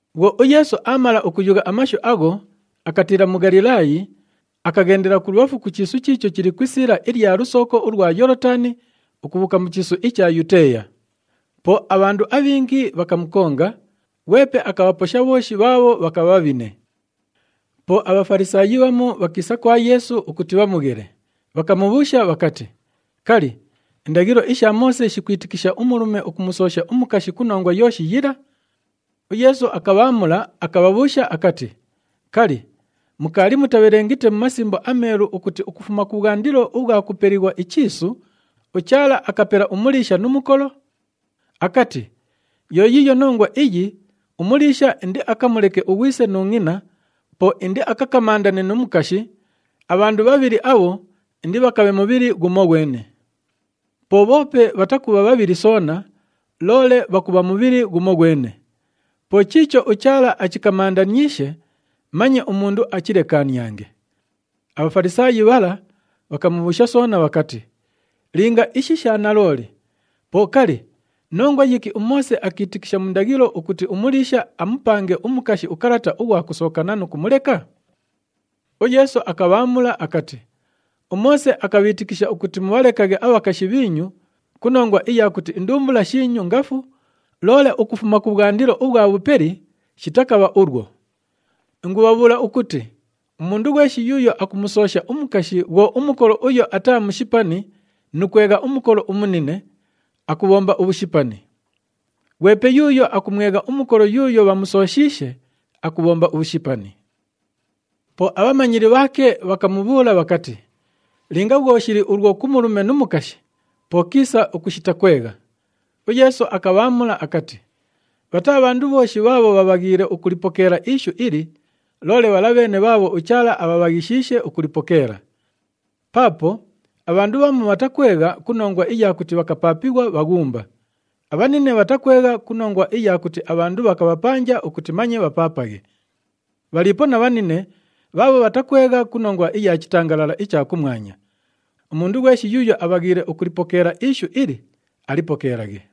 Bhwo uYeesu aamala ukuyugha amashu agho, akatiila mu Ghalilaayi, akaghendela kulubhafu ku chiisu chiicho chili ku isiila ilya lusooko ulwa Yoolotani, ukubhuuka mu chiisu icha Yuteeya. Po abhandu abhingi bhakamukonga, ghwepe akabhaposha bhooshi bhaabho bhakabha bhabhine. Po aBhafalisaayi bhamu bhakiisa kwa Yeesu, ukuti bhamughele, bhakamubhuusha bhakati, “Kali, indaghilo isha Moose shikwitikisha umulume ukumusoosha umukashi ku nongwa yooshi yila?” UYeesu akabhaamula, akabhabhuusha akati, “Kali, mukaali mutabhelengite mu Masimbo aMeelu ukuti ukufuma kubhwandilo ubhwa kupelighwa ichiisu ‘uChaala akapela umuliisha nu mukolo’? Akati, ‘Yo yiiyo nongwa iyi umuliisha indiakamuleke ughwise nu ngʼina, po indiakakamandane nu mukashi, abhandu bhabhili abho indibhakabhe mubhili ghumoghwene.’ Po bhoope bhatakubha bhabhili soona, loole bhakubha mubhili ghumoghwene. Po chiicho uChaala achikamandaniishe, manye umundu achilekaaniange.” ABhafalisaayi bhala bhakamubhuusha soona bhakati, “Linga ishi sha nalooli, po kali, nongwa yiki uMoose akiitikisha mu ndaghilo ukuti umuliisha amupange umukashi ukalata ughwa kusookana nu kumuleka?” UYeesu akabhaamula akati, “UMoose akabhiitikisha ukuti mubhalekaghe abhakashi bhiinyu ku nongwa iya kuti indumbula shiinyu ngafu, loole ukufuma kubhwandilo ubhwa bhupeli, shitakabha ulwo. Ingubhabhuula ukuti umundu ghweshi yuuyo akumusoosha umukashi bhwo umukolo uyo ataa mushipani nu kwegha umukolo umunine, akubhomba ubhushipani. [Ghwepe yuuyo akumwegha umukolo yuuyo bhamusooshiishe, akubhomba ubhushipani.]” Po abhamanyili bhaake bhakamubhuula bhakati, “Linga bhwo shili ulwo ku mulume nu mukashi, po kiisa ukushita kwegha!” UYeesu akabhaamula akati, “Bhataa bhandu bhooshi bhaabho bhabhaghiile ukulipokeela ishu ili, loole bhala bheene bhaabho uChaala abhabhaghishiishe ukulipokeela. Paapo abhandu bhamu bhatakwegha ku nongwa iya kuti bhakapaapighwa bhaghumba. Abhanine bhatakwegha ku nongwa iya kuti abhandu bhakabhapanja ukuti manye bhapaapaghe. Bhaliipo na bhanine bhaabho bhatakwegha ku nongwa iya chitangalala icha kumwanya. Umundu ghweshi yuuyo abhaghiile ukulipokeela ishu ili, alipokeelaghe.”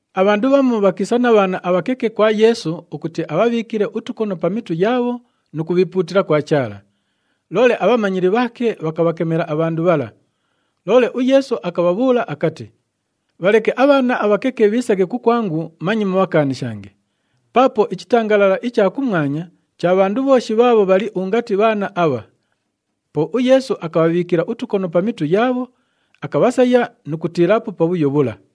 Abhandu bhamu bhakiisa na bhaana abhakeke kwa Yeesu ukuti abhabhiikile utukono pa mitu yaabho nu kubhiipuutila kwa Chaala. Loole abhamanyili bhaake bhakabhakemela abhandu bhala. Loole uYeesu akabhabhuula akati, “Bhaleke abhaana abhakeke bhiisaghe kukwangu, manye mubhakaanishange. Paapo ichitangalala icha kumwanya cha bhandu bhooshi bhaabho bhali ungati bhaana abha.” Po uYeesu akabhabhiikila utukono pa mitu yaabho, akabhasaya nu kutiilaapo pabhuyo bhula.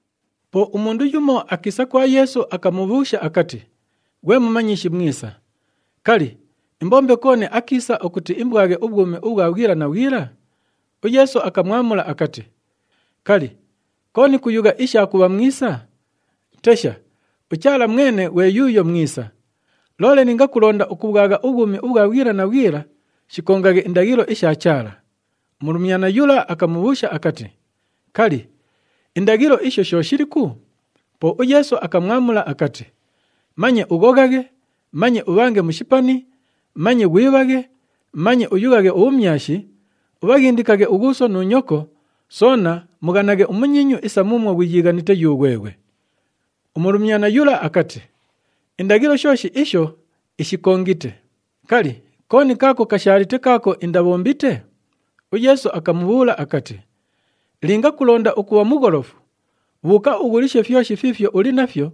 Po umundu yumo akiisa kwa Yeesu, akamubhuusha akati, “Ghwe Mumanyishi mwisa, kali, imbombe kooni akiisa ukuti imbwaghe ubhwumi ubhwa bhwila na bhwila?” UYeesu akamwamula akati, “Kali, kooni kuyugha isha kubha mwisa? Tesha, uChaala mwene ghwe yuuyo mwisa! Loole linga kulonda ukubhwagha ubhwumi ubhwa bhwila na bhwila, shikongaghe indaghilo isha Chaala.” Umulumyana yula akamubhuusha akati, “Kali, indaghilo isho sho shiliku?” Po uYeesu akamwamula akati, “Manye ughoghaghe, manye ubhange mushipani, manye ghwibhaghe, manye uyughaghe ubhumyashi, ubhaghindikaghe ughuuso nu nyoko,” soona, “Mughanaghe umunyiinyu isa muumwo ghwiyiighanite yughweghwe.” Umulumyana yula akati, “Indaghilo shooshi isho ishikongite. Kali, kooni kaako kashaalite kaako indabhombite?” UYeesu akamubhuula akati, “Linga kulonda ukubha mugholofu, bhuuka ughulishe fyoshi fiifyo uli nafyo,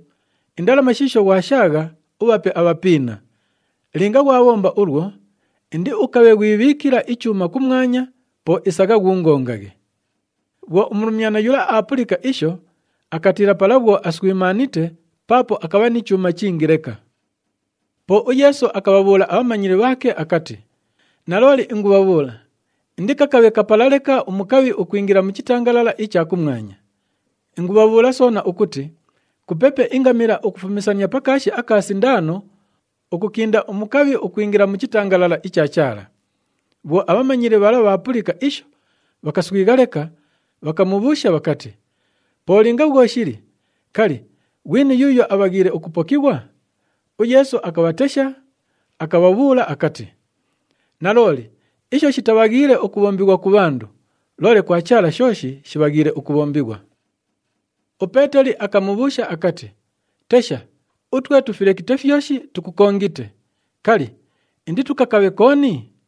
indalama shiisho ghwashaagha, ubhape abhapiina. Linga ghwabhomba ulwo, indiukabhe ghwibhiikila ichuuma kumwanya, po isagha, ghuungongaghe.” Bhwo umulumyana yula aapulika isho, akatiila pala bhwo aswimaanite paapo akabha ni chuuma chingi leka. Po uYeesu akabhabhuula abhamanyili bhaake akati, “Nalooli ingubhabhuula, indikakabhe kapala leka umukabhi ukwingila mu chitangalala icha kumwanya. Ingubhabhuula soona ukuti kupepe ingamila ukufumisania pa kaashi aka sindaano, ukukinda umukabhi ukwingila mu chitangalala icha Chaala.” Bhwo abhamanyili bhala bhaapulika isho, bhakaswigha leka, bhakamubhuusha bhakati, “Po linga bhwo shili, kali, ghwini yuuyo abhaghiile ukupokighwa?” UYeesu akabhatesha, akabhabhuula akati, “Nalooli isho shitabhaghiile ukubhombighwa ku bhandu, loole kwa Chaala shooshi shibhaghiile ukubhombighwa.” UPeeteli akamubhuusha akati, “Tesha, utwe tufilekite fyoshi, tukukongite. Kali, inditukakabhe kooni?”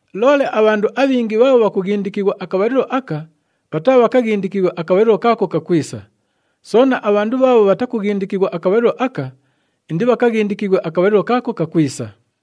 Loole abhandu abhingi bhaabho bhakughindikighwa akabhalilo aka, bhataabhakaghindikighwe akabhalilo kaako kakwisa. Soona, abhandu bhaabho bhatakughindikighwa akabhalilo aka, indibhakaghindikighwe akabhalilo kaako kakwisa.”